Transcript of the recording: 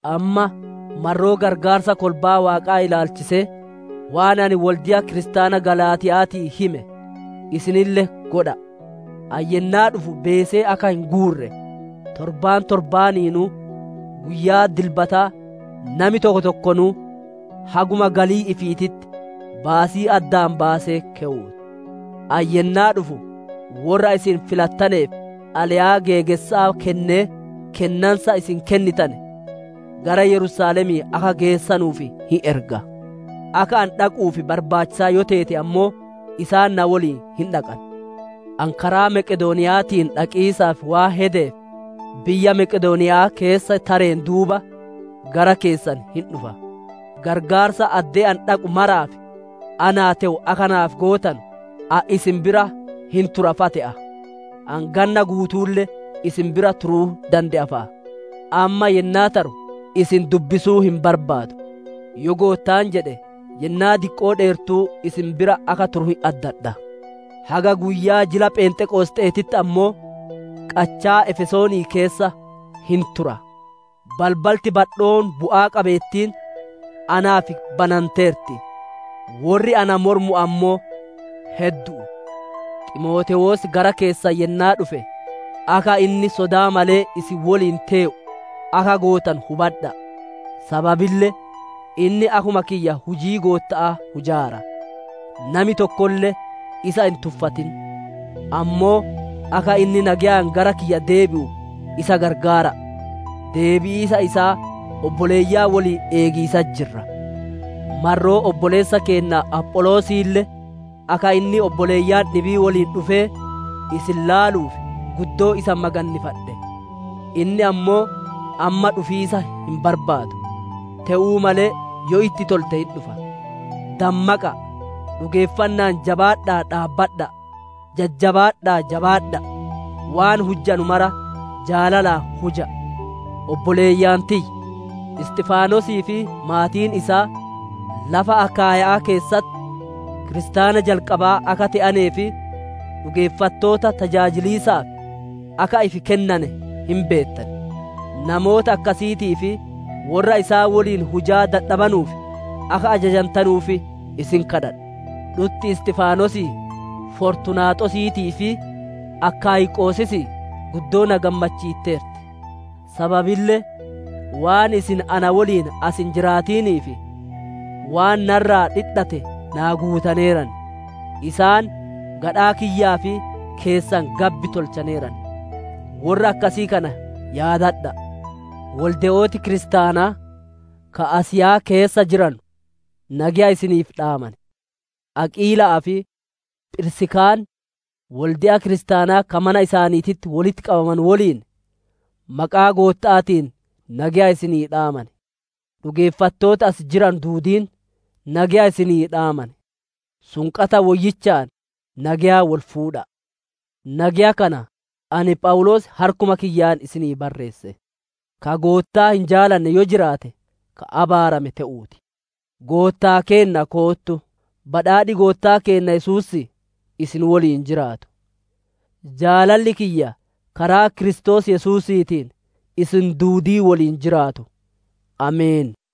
Amma marroo qarqaarsa kolbaa Waaqaa ilaalchisee, waan ani wolde'a kiristaana Galaatiya'aatii hime, isinille godha'a. Ani yennaa dhufu beesee akka hin guurre, torbaan torbaaniinuu guyyaa dilbataa nami tokko tokkonuu, haguma galii ifiititti baasii addaan baasee keyuu ti. Ani yennaa dhufu, worra isin filattaneef xalayaa geegessa'aa kennee, kennansa isin kennitane gara Yerusaalemii akka geessanuuf hin erga. Akka ani dhaquuf barbaachisaa yoo teete ammoo, isaan na woliin hin dhaqan. Ani karaa Meqedooniya'aatiin dhaqiisaaf waan hedeef, biyya Meqedooniya'aa keessa tareen duuba, gara keessan hin dhufa. Qarqaarsa addee ani dhaqu maraaf naa te'u akka naaf gootanu, ani isin bira hin tura fa'a te'a. Ani ganna guutuulle isin bira turuu dande'a fa'a. Amma yennaa taru isin dubbisuu hin barbaadu; yoo Goottaan jedhe, yennaa diqqoo dheertuu isin bira akka turu hin addadha. Haga guyyaa jila Phenxeqosxe'eetitti ammoo, qachaa Efesoonii keessa hin tura. Balbalti badhoon bu'aa qabeettiin naaf bananteerti. Worri ana mormu ammoo heddu'u. Ximootewoos gara keessan yennaa dhufe, akka inni sodaa malee isin woliin tee'u akka gootanu hubadha'a; sababille inni akkuma kiyya hujii Gootta'aa hujaara. Nami tokkolle isa hin tuffatin; ammoo akka inni nageyaan gara kiyya deebi'u isa gargaara'a. Deebi'iisa isaa obboleeyyan woliin eegiisatti jirra. Marroo obboleessa keenna Apholoosiille, akka inni obboleeyyan dhibii woliin dhufee isin ilaaluuf, guddoo isa magannifadhe. Inni ammoo amma dhufiisa hin barbaadu; te'uu malee yoo itti tolte hin dhufa. Dammaqa'a; dhugeeffanna'aan jabaadha'aa dhaabbadha'a; jajjabaadha'aa, jabaadha'a. Waan hujjanu mara jaalalaan huja'a. Obboleeyyan tiyya! Isxifaanosii fi maatiin isaa lafa Akaayya'aa keessatti kiristaana jalqabaa akka te'anee fi dhugeeffattoota tajaajiliisaaf akka ifi kennane hin beettan. Namoota akkasiitii fi worra isaan woliin hujaa dadhabanuuf akka ajajantanuuf isin kadhadha'a. Dhutti Isxifaanosii, Fortunaaxosiitii fi Akaayqosisii guddoo na gammachiitteerti. Sababille waan isin na woliin as hin jiraatiniif, waan na irraa dhidhate naa guutaneeran. Isaan gadhaa kiyyaa fi keessan gabbi tolchaneeran. Worra akkasii kana yaadadha'a. Wolde'ooti kiristaanaa ka Asiyaa keessa jiranu nageya isiniif dhaaman; Aqiila'aa fi Phirsikaan, wolde'a kiristaanaa ka mana isaaniititti wolitti qabamu woliin maqaa Gootta'aatiin nageya isinii dhaaman. Dhugeeffattooti asi jiranu duudiin nageya isinii dhaaman. Sunqata woyyichaan nageya wol fuudha'a. Nageya kana ani Phawuloos harkuma kiyyaan isinii barreesse. Ka Goottaa hin jaalanne yoo jiraate, ka abaarame te'uu ti! Goottaa keenna koottu! Badhaadhi Goottaa keenna Yesuusii isin woliin jiraatu. Jaalalli kiyya karaa Kiristoos Yesuusiitiin isin duudii woliin jiraatu. Ameen.